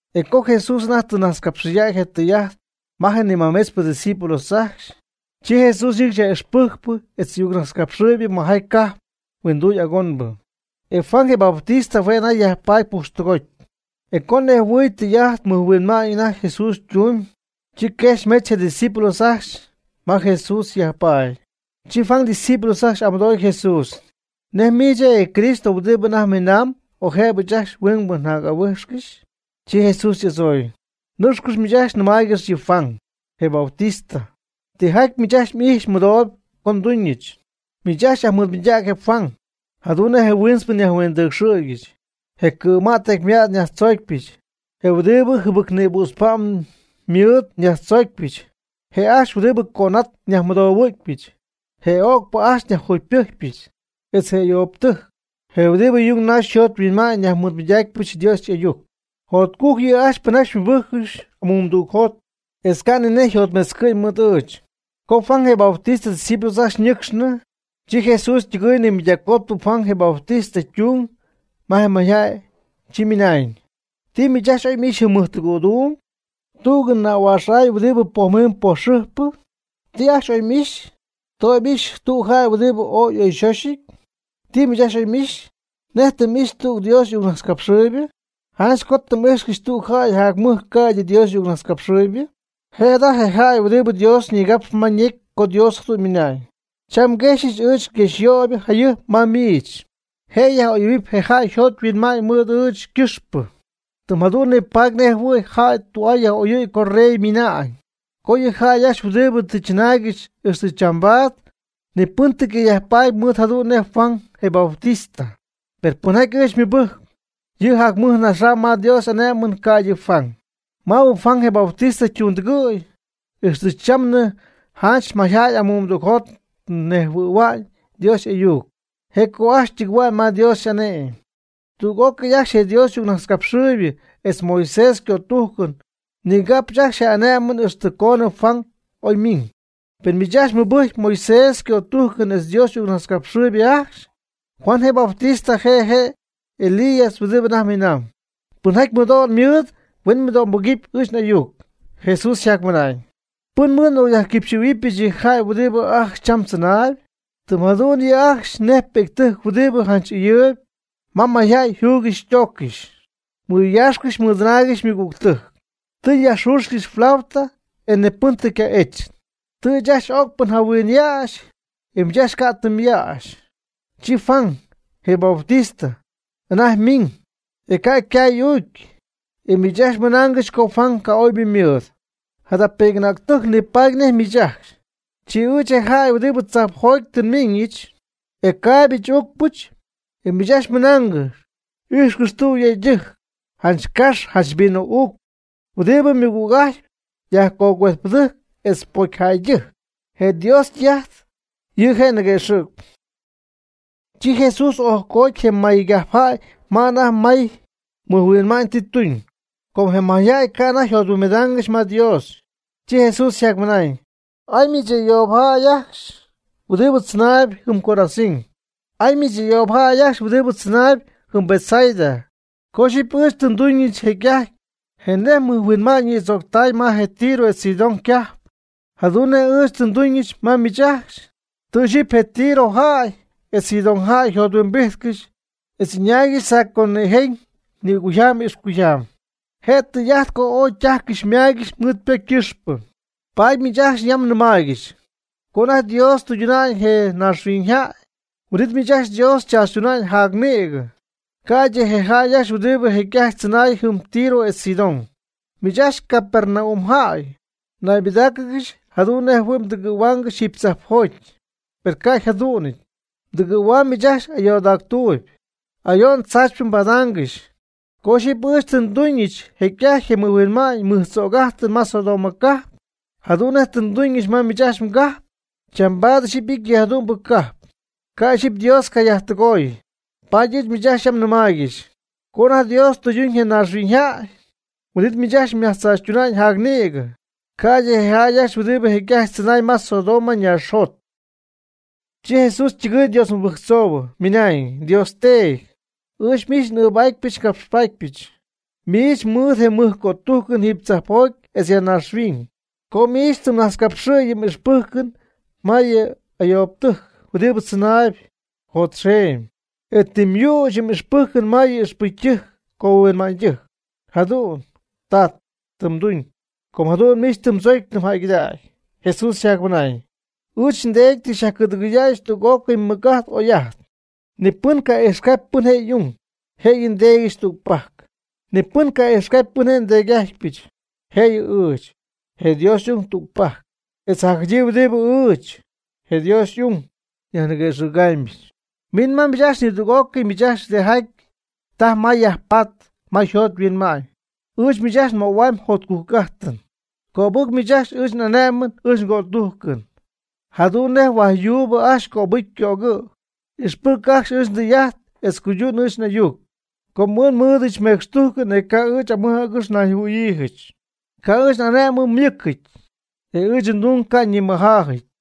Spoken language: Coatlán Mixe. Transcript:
E co Jesús anajty tɨ najtzcapxɨydäy je tɨyy'ajt ma je nimajmetzpɨ ydiscípulos ajcxy, chi Jesús ñɨcxy yaj'ixpɨjcp etz ayuccapxhuäcxp majaty cajp huinduy agonbɨ. E Juan je Bautista hue' je' anajty yajpaady pujxtɨgoty. E co nejhuɨy tijaty mɨjhuinma'ñ anajty Jesús ytumyb, chi quejxy metz je' ydiscípulos ajcxy ma Jesús yajpaady. Chi Juan ydiscípulos ajcxy y'amɨdooy Jesús: ―¿Nej miich je' je Cristo huɨdibɨ anajty minamb o jëbɨ ɨɨch ajcxy huingbɨ n'ahuijxcɨxy? Chi Jesús y'adzooy: ―Nɨcxcɨx miich ajcxy nɨmaaygɨx yɨ Juan, je Bautista, tijaty miich ajcxy m'ijxpy mmɨdooyb co ndumybɨch. Miich ajcxy yajmɨɨdmɨydäg je Juan, jadu'n nej je huintzpɨ nyajhuindɨcxɨ̈gyɨch; je cɨ̈mät tecymät nyajtzoocypɨch; je huɨdibɨ jɨbɨc nïbützpa'm ymɨɨd nyajtzoocpyɨch; je' ajcxy huɨdibɨ cönat nyajmɨdohuɨ̈cpyɨch; je öcpɨ ajcxy nyajjugypɨjcpyɨch; etz je ayoobtɨjc, je huɨdibɨ yung naxy yjothuinma'ñ nyajmɨɨdmɨydacypɨch Dios y'ayuc. Jotcujc yɨ' ajcxy pɨnjaty xymɨbɨjcpɨch amumdügjot etz ca' ni nej yjotmetzcɨ' mɨɨd ɨɨch. Co Juan je Bautista ydiscípulos ajcxy ñɨcxnɨ, chi Jesús ytɨgɨɨy nimɨydaccoty Juan je Bautista ytung ma je mayjäy, chi ymɨnañ: ―¿Ti miich ajcxy oy m'ixy jɨm mɨjtɨgɨ̈duum? ¿Tüg nähuaax huɨdibɨ poj xɨjpɨ? ¿Ti ajcxy oy m'ixy? ¿Ti oy m'ixy, tüg jäy huɨdibɨ ooy y'oyxöxyɨty? ¿Ti miich ajcxy oy m'ixy? ¿Nej tɨ m'ixy tüg Dios y'ayucnajtzcapxɨɨybɨ? Janch co tɨ m'íjxcɨxy tüg jäy jac mɨj ca'ydɨ tüg Dios y'ayucnajtzcapxɨɨybɨ. Je' jada je jäy huɨdibɨ Dios nigapxy ma ñecy co Dios jadu'n ymɨnañ: Cham nguexyɨch ɨɨch nguexyöyp jayɨjp ma miich. Je' yaj'oyɨ̈huɨp je jäy yjot yhuinma'ñ mɨɨd ɨɨch ycɨxpɨ, tɨm jadu'n nipaady nej jɨhuɨ̈y jäy tü'aa yaj'oyɨ̈y co rey ymiina'ñ. Co yɨ jäy ajcxy huɨdibɨ tɨ chɨnaaygɨxy ixtɨ chambaad ni pɨn tɨ ca' yajpaady mɨj jadu'n nej Juan je Bautista; per pɨnjaty ɨɨch xymɨbɨjcp, yɨ' jac mɨj naxam ma Dios y'ane'my ca'ydɨ Juan. Maabɨ Juan je Bautista ytundɨgɨ̈y, ixtɨ chamnɨ janch mayjäy amumdügjot ñejhuɨ̈hua'ñ Dios y'ayuc, je' co ajcxy ytɨgɨ̈hua'ñ ma Dios y'ane'my. Tüg'ócɨy ajcxy je Dios y'ayucnajtzcapxɨɨybɨ etz Moisés ycötujcɨn ñigapxy ajcxy je ané'mɨn ixtɨ coonɨ Juan oy ymiñ. Pen miich ajcxy mɨbɨjcpy Moisés ycötujcɨn etz Dios y'ayucnajtzcapxɨɨybɨ ajcxy, Juan je Bautista je' je' je Elías huɨdibɨ anajty miinamb. Pɨnjaty mɨdo'n mɨɨd huen mɨdo'mbɨgɨpy ɨɨch n'ayuc. Jesús yjacmɨnañ: ―¿Pɨn mɨɨd n'ocyajtügɨ̈huɨbyɨch yɨ jäy huɨdi ajcxy cham tzɨnaayb? Tɨm jadu'n yɨ' ajcxy nej pi'ctɨjc huɨdibɨ ajcxy ɨyɨɨyb ma mayjäy yjuygɨxy ytooccɨxy, mɨyaaxcɨxy mɨdɨnaaygɨxy ymɨgügtɨjc: “Tɨ njayajxüxyɨch flauta e ni ca' tɨ m'ejtzcɨxy; tɨ ɨɨch ajcxy öcpɨ njahuinyäxɨch, e miich ajcxy ca' tɨ myäxy.” Chi Juan, je Bautista, anajty miiñ, e je' ca' ycay y'ügy. E miich ajcxy mɨnaangɨxy co Juan ca'oybɨ ymɨɨdɨty. Jada pi'c'anäctɨjc nipaady nej miich ajcxy. Chi ɨɨch je' je jäy huɨdibɨ tzoon tzajpjoty nmiiñɨch, e caaybɨch uucpɨch, e miich ajcxy mɨnaangɨxy: “Ijxcɨx, cha tüg yëydɨjc, janch cax janch vino'ucp huɨdibɨ mɨgüg'ajtpy yajcuejtpɨdɨjc etz pocyjäydɨjc.” Je Dios tɨy'ajt ji je' ñiguëxɨ̈gy. Chi Jesús ojcoty je maygajpjäy ma anajty may mɨjhuinma'ñ tɨ tuñ, com je mayjäy ca' anajty yjothuimbidaangɨxy ma Dios. Chi Jesús ymɨnañ: ―¡Ay miich ayoob ajcxy huɨdibɨ tzɨnaayb jɨm Corazín! ¡Ay miich ayoob ajcxy huɨdibɨ tzɨnaayb jɨm Betsaida! Co ixyipy ɨɨch tɨ nduñɨch jecy'ajty je mɨjhuinma'ñ mɨjtzög'ajtɨn ma je Tiro etz Sidón cajp, jadu'n nej ɨɨch tɨ nduñɨch ma miich ajcxy, tɨ ixyipy je Tiro jäy etz Sidón jäy nijothuimbijtcɨxy etz ɨñaaygɨxy saco nïjen nïcuyjam ixcuyjam, je' je tɨy'ajt co ooy ytajcɨxy ymaygɨxy mɨɨd ypocy ycɨxpɨ. Paady miich ajcxy yam nɨmaaygɨxy. Co anajty Dios tɨyduna'ñ je naaxhuiñybɨ jäy, huin'it miich ajcxy Dios xychaachytuna'ñ jac nïgɨ, ca'ydɨ je jäy ajcxy huɨdibɨ jecy'ajty tzɨnay jɨm Tiro etz Sidón. Miich ajcxy, Capernaum jäy, mnaybɨdáacɨgɨxy jadu'n nej jɨhuɨ̈y mdɨgɨ̈huaangɨxy jiiby tzajpjoty. Per ca' yjadu'nɨty. Mdɨgɨ̈huam miich ajcxy ayoodactuuby. Ayo'n tzaachypɨ mbadaangɨxy. Co ixyipy ɨɨch tɨ nduñɨch jecy'ajty je mɨjhuinma'ñ mɨj tzög'ajtɨn ma Sodoma cajp, jadu'n nej tɨ nduñɨch ma miich ajcxy mgajp, chambaad ixyipy ity yɨ jadu'mbɨ cajp, ca' ixyipy Dios cayajtɨgooy. Paady ɨɨch miich yam nɨmaaygɨxy. Co anajty Dios tɨyduna'ñ je naaxhuiñyjäy, huin'it miich ajcxy myajtzaachytuna'ñ jac nïgɨ, ca'ydɨ je jäy huɨdibɨ jecy'ajty tzɨnay ma Sodoma ñaaxjot. Chi Jesús ytɨgɨɨy Dios mɨbɨjctzooyb, ymɨnañ: ―Dios Teedy, ɨɨch miich n'ɨɨbaatpɨch ngapxpaatpɨch. Miich mɨɨd je mɨj cötujcɨn jiiby tzajpjoty etz ya naaxhuiñ. Com miich tɨ mnajtzcapxɨy yɨ m'ixpɨjcɨn ma je ayoobtɨjc huɨdibɨ tzɨnaayb jotxeemy, e tɨ myüch yɨ m'ixpɨjcɨn ma yɨ ixpɨcytɨjc cohuinma'ñydɨjc. Jadu'n, Tat, tɨ mduñ, com jadu'n miich tɨ mdzocy tɨ mjäygɨdägy. Jesús yjacmɨnañ: ―Ɨɨch nDeedy tɨ xyajcɨ̈dɨgɨydäyɨch tüg'ócɨy mɨc'ajt oy'ajt. Ni pɨn ca' ijxcapy pɨn je' y'ung, jëyɨ nDeedyɨch tügpajc. Ni pɨn ca' ijxcapy pɨn je' nDeedy'ájtpyɨch, jëyɨ ɨɨch, je Dios y'ung tügpajc, etz jacjadyii huɨdibɨ ɨɨch, je Dios y'ung, nyajniguëxɨ̈gamyɨch. Min ma ɨɨch nidüg'ócɨy miich ajcxy huɨdijaty taj mayb myajpatp ma mjot mhuinma'ñ, ɨɨch miich ajcxy nmöhuamyb jotcujc'ajtɨn. Cöbɨc miich ajcxy ɨɨch n'ane'mɨn ɨɨch ngötujcɨn, jadu'n nej huaj yuub ajcxy cöbɨcy ycögɨ'. Ijxpɨc ajcxy ɨɨch ndɨy'ajt etz cuydun ɨɨch n'ayuc, com ɨɨch nmɨɨdɨch mecxtujcɨn etz ca' ɨɨch amɨj agɨx nayjɨhuɨ̈yiijɨch. Ca' ɨɨch n'ane'mɨn ymɨcɨty, e ɨɨch ndung ca' nimɨjaajɨty.